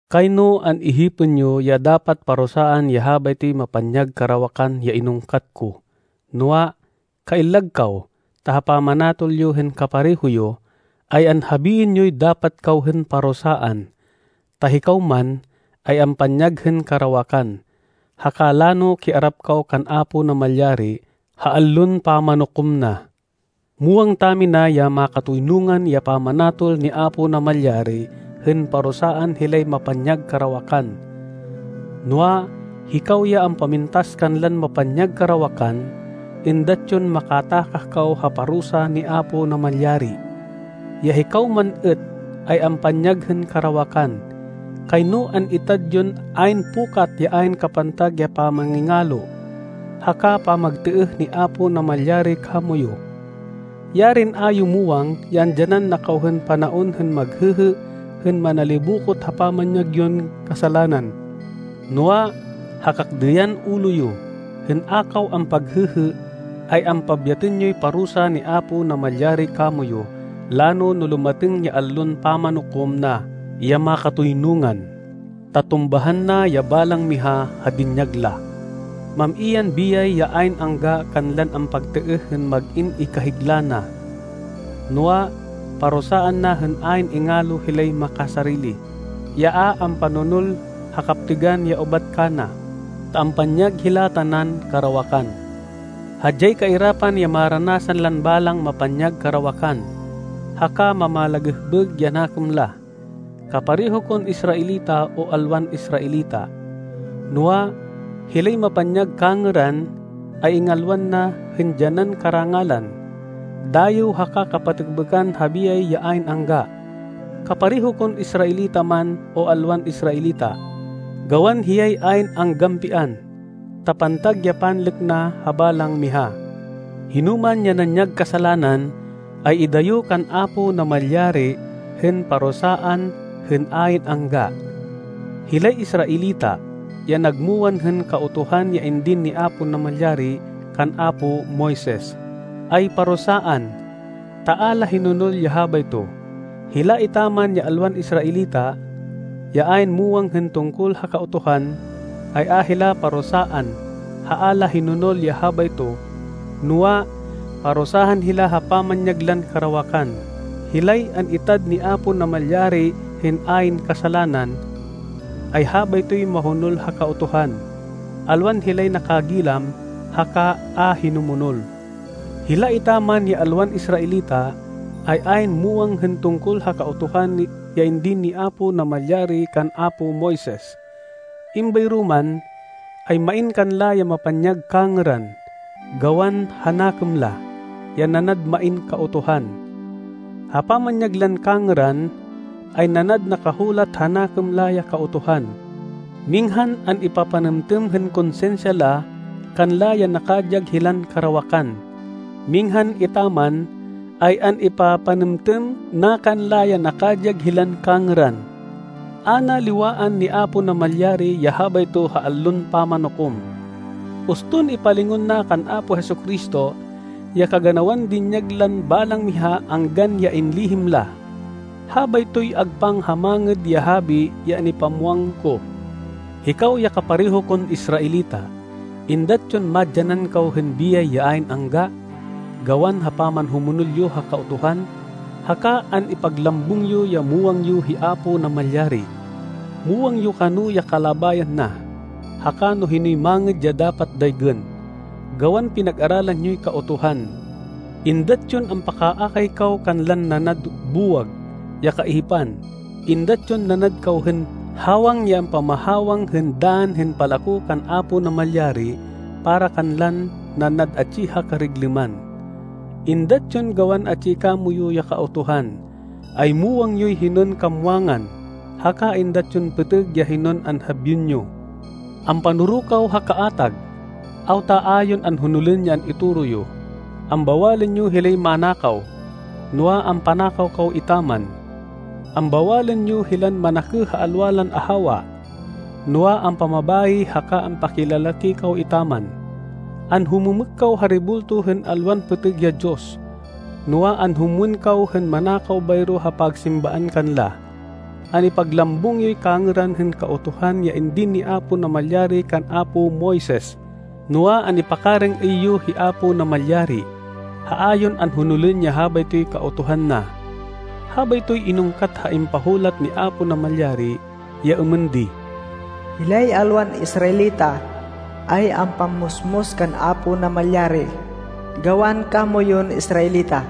Kayno an-ihipên yo ya dapat parusaan ya habaytoy mapanyag karawakan ya inungkat ko. Noa, kaillag kaw, ta ha pamanatol yo hên kapareho yo, ay anhabiên yoy dapat kaw hên parusaan, ta hikaw man, ay ampanyag hên karawakan, haka lano kiarap kaw kan Apo Namalyari ha Allon Pamanukom na. Muwang tamina ya makatoynungan ya pamanatol ni Apo Namalyari hên parusaan hilay mapanyag karawakan. Noa, hikaw ya ampamintas kanlan mapanyag karawakan, êndat yon makatakah kaw ha parusa ni Apo Namalyari, ya hikaw man êt, ay ampanyag hên karawakan! Kayno an-itad yon ayn pukat ya ayn kapantag ya pamangingalo, haka pamagtêêh ni Apo Namalyari kamoyu! Yarin a yo muwang ya andyanan na kaw hên panaon hên maghêhê hên manalibokot ha pamanyag yon kasalanan! Noa, ha kakdêyan ulo yo, hên a kaw ampaghêhê, ay ampabyatên yoy parusa ni Apo Namalyari kamoyu lano no lumatêng ya Allon Pamanukom na ya makatoynungan, ta tumbahan na ya balang miha ha dinyag la. Mam-i yan biyay ya ayn angga kanlan ampagtêêh hên mag-in ikahigla na. Noa, parusaan na hên ayn ingalo hilay makasarili, ya a ampanonol ha kaptêgan ya ubat kana, ta ampanyag hila tanan karawakan. Hadyay kairapan ya maranasan lan balang mapanyag karawakan, haka mamalagêhbêg ya nakêm la, kapareho kon Israelita, o alwan Israelita. Noa, hilay mapanyag kangêran, ay ingalwan na hên dyanan karangalan, dayêw haka kapatêkbêkan ha biyay ya ayn angga, kapareho kon Israelita man, o alwan Israelita. Gawan hiyay ayn anggampian, ta pantag ya panlêk na ha balang miha. Hinoman ya nanyag kasalanan, ay idayo kan Apo Namalyari hên parusaan hên ayn angga. Hilay Israelita, ya nagmuwang hên Kautuhan ya indin ni Apo Namalyari kan apo Moises, ay parusaan, ta a la hinonol ya habayto. Hila etaman ya alwan Israelita, ya ayn muwang hên tungkol ha Kautuhan, ay a hila parusaan ha a la hinonol ya habayto, noa, parusaan hila ha pamanyag lan karawakan. Hilay an-itad ni Apo Namalyari hên ayn kasalanan, ay habaytoy mahonol ha Kautuhan, alwan hilay nakagilam haka a hinumonol. Hila etaman ya alwan Israelita, ay ayn muwang hên tungkol ha Kautuhan ya indin ni Apo Namalyari kan apo Moises. Êmbayro man, ay main kanla ya mapanyag kangêran, gawan ha nakêm la, ya nanad main kautuhan. Ha pamanyag lan kangêran, ay nanad nakahulat ha nakêm la ya Kautuhan. Minghan an-ipapanêmtêm hên konsinsya la kanla ya nakadyag hilan karawakan, minghan etaman, ay an-ipapanêmtêm na kanla ya nakadyag hilan kangêran. A na liwaan ni Apo Namalyari ya habayto ha Allon Pamanukom, uston ipalingon na kan Apo Jesu-Cristo, ya kaganawan dinyag lan balang miha anggan ya inlihim la. Habaytoy agpang ha Mangêd ya Habi ya an-ipamwang ko. Hikaw ya kapareho kon Israelita, êndat yon madyanan kaw hên biyay ya ayn angga, gawan ha pamanhumonol yo ha Kautuhan, haka an-ipaglambung yo ya muwang yo hi Apo Namalyari. Muwang yo kano ya kalabayan na, haka no hinoy mangêd ya dapat daygên, gawan pinag-aralan yoy Kautuhan. Êndat yon ampakaakay kaw kanlan nanad buwag ya kaihipan! Êndat yon nanad kaw hên hawang ya ampamahawang hên dann hên palako kan Apo Namalyari para kanlan nanad atsi ha kariglêman. Êndat yon gawan atsi kamoyu ya Kautuhan, ay muwang yoy hinon kamwangan, haka êndat yon pêtêg ya hinon anhabiên yo. Ampanoro kaw ha kaatag! Awta a yon an-honolên ya an-itoro yo! Ambawalên yo hilay manakaw, noa, ampanakaw kaw etaman! Ambawalên yo hilan manakêh ha alwa lan ahawa, noa, ampamabayi haka ampakilalaki kaw etaman! Anhumêmêk kaw ha rebulto hên alwan pêtêg ya diyos, noa, anhumwên kaw hên manakaw bayro ha pagsimbaan kanla! An-ipaglambung yoy kangêran hên Kautuhan ya indin ni Apo Namalyari kan apo Moises, noa, an-ipakarêng-êy yo hi Apo Namalyari, ha a yon anhonolên ya habaytoy Kautuhan na! Habaytoy inungkat ha impahulat ni Apo Namalyari ya êmên di, “Hilay alwan Israelita, ay ampammusmus kan Apo Namalyari gawan kamoyun Israelita.”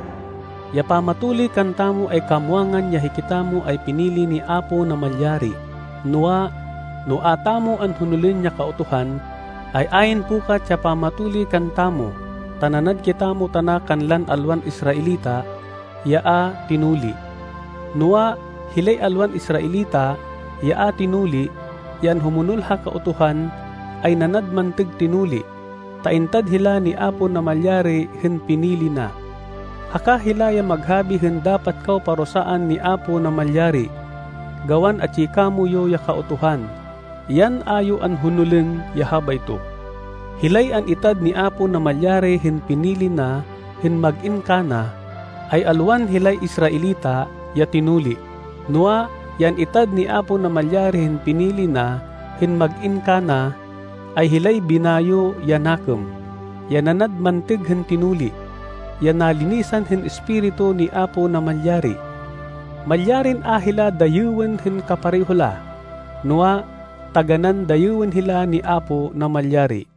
Ya pamatuli kantamo ay kamwangan ya hikitamo ay pinili ni Apo Namalyari, noa, no a tamo anhonolên ya Kautuhan, ay ayn pukat ya pamatuli kantamo, ta nanad kitamo tana kanlan alwan Israelita, ya a tinuli. Noa, hilay alwan Israelita, ya a tinuli, ya anhumonol ha Kautuhan, ay nanad mantêg tinuli, ta an-itad hila ni Apo Namalyari hên pinili na. Haka hila ya maghabi hên dapat kaw parusaan ni Apo Namalyari, gawan atsi kamoyu ya Kautuhan, yan a yo anhonolên ya habayto. Hilay an-itad ni Apo Namalyari hên pinili na hên mag-in kana, ay alwan hilay Israelita, ya tinuli. Noa, ya an-itad ni Apo Namalyari hên pinili na hên mag-in kana, ay hilay binayo ya nakêm, ya nanad mantêg hên tinuli, ya nalinisan hên Espiritu ni Apo Namalyari. Malyarin a hila dayêwên hên kapareho la, noa, taganán dayêwên hila ni Apo Namalyari.